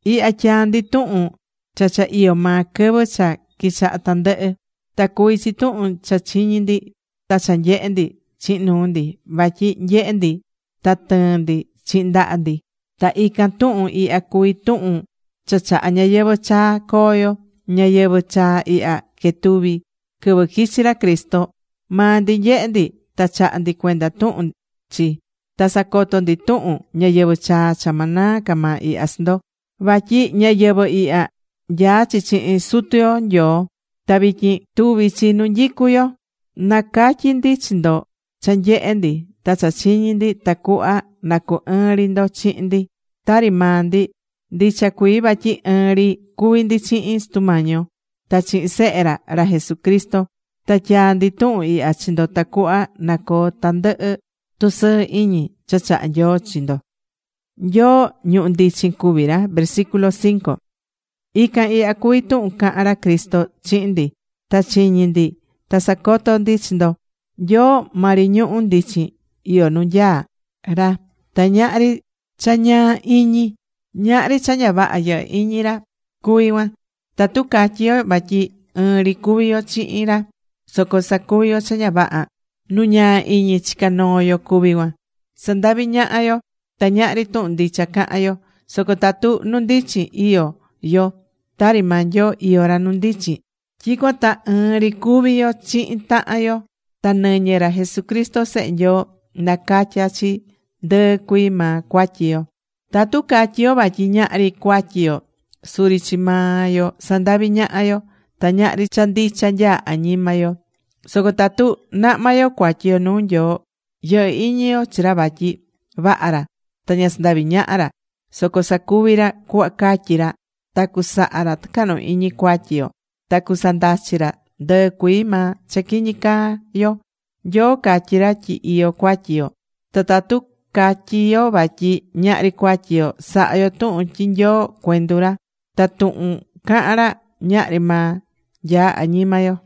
Ihya tyaá ndi tuhun cha cha iyó maa quɨvɨ cha quichaha̱ tandɨhɨ. Ta cuví chi tuhun cha chiñi̱ ndi ta cha nyehe̱ ndi chihin nuu ndi; vatyi nyehe̱ ndi ta tɨɨ̱n ndi chihin ndaha ndi. Ta ican tuhun ihya cuví tuhun cha chahá ñayɨvɨ̱ chaa coo yo. Ñayɨvɨ̱ chaa ihya quetuvi̱ quɨvɨ quichi̱ ra Cristo. Maa ndi nyehe̱ ndi ta chahá ndi cuenda tuhun chi; ta sacotó ndi tuhun ñayɨvɨ̱ chaa cha ma naa ca maa ihya chi ndo. Vatyi ñayɨvɨ̱ ihya, nyaá chi chihin Sutu yo Nyoo, ta vityin tuví chi nu nyicú yo. Nacatyí ndi chi ndo cha nyehe̱ ndi ta cha chiñi̱ ndi tacuhva na cu ɨɨn ri ndo chihin ndi, tari maa ndi, ndicha cuii vatyi ɨɨn ri cuví ndi chihin Sutu yo Nyoo ta chihin Sehe ra, ra Jesucristo. Ta tyaá ndi tuhun ihya chi ndo tacuhva na coo tandɨhɨ tusɨɨ iñi cha chahá Nyoo chi ndo.Nyoo, ñuhu̱ ndichin cuví ra Ican ihya cuví tuhun cahán ra Cristo chihin ndi. Ta chiñi̱ ndi ta sacotó ndi chi ndo: Nyoo maa ri ñuhu̱ ndichin iyó nu nyaá ra. Ta ñahri cha ñaa iñi, (ñahri cha ña vaha yɨhɨ́ iñi ra cuví cuan). Tatu catyí yo vatyi ɨɨn ri cuví yo chihin ra, soco sacuví yo cha ña vaha, nu ñaa iñi chicá noo yo cuví cuan. Sandaví ñaha yo. Ta ñahri tuhun ndicha cahán yo. Soco tatu nu ndichin iyó yo, tari maa Nyoo iyó ra nu ndichin, tyicuan ta ɨɨn ri cuví yo chihin tahan yo, ta nɨñɨ ra Jesucristo Sehe Nyoo, nacatyá chi ndɨɨ cuii maa cuatyi yo. Tatu catyí yo vatyi ñahri cuatyi yo, suri chi maa yo sandaví ñaha yo, ta ñahri cha ndicha nyaá añima yo. Soco tatu nahmá yo cuatyi yo nuu Nyoo, yɨhɨ́ iñi yo chi ra vatyi vaha ra ta ña sandavi ñaha ra, soco sacuví ra cuhva catyí ra, ta cusaha ra tɨcahnu iñi cuatyi yo ta cusandachi ra ndɨɨ cuii maa cha quiñi caa yo. (Nyoo catyí ra tyi iyó cuatyi yo), ta tatu catyí yo vatyi ñahri cuatyi yo, sahá yo tuhun tyi Nyoo, cuendu ra. Ta tuhun cahán ra, ñahri maa nyaá añima yo.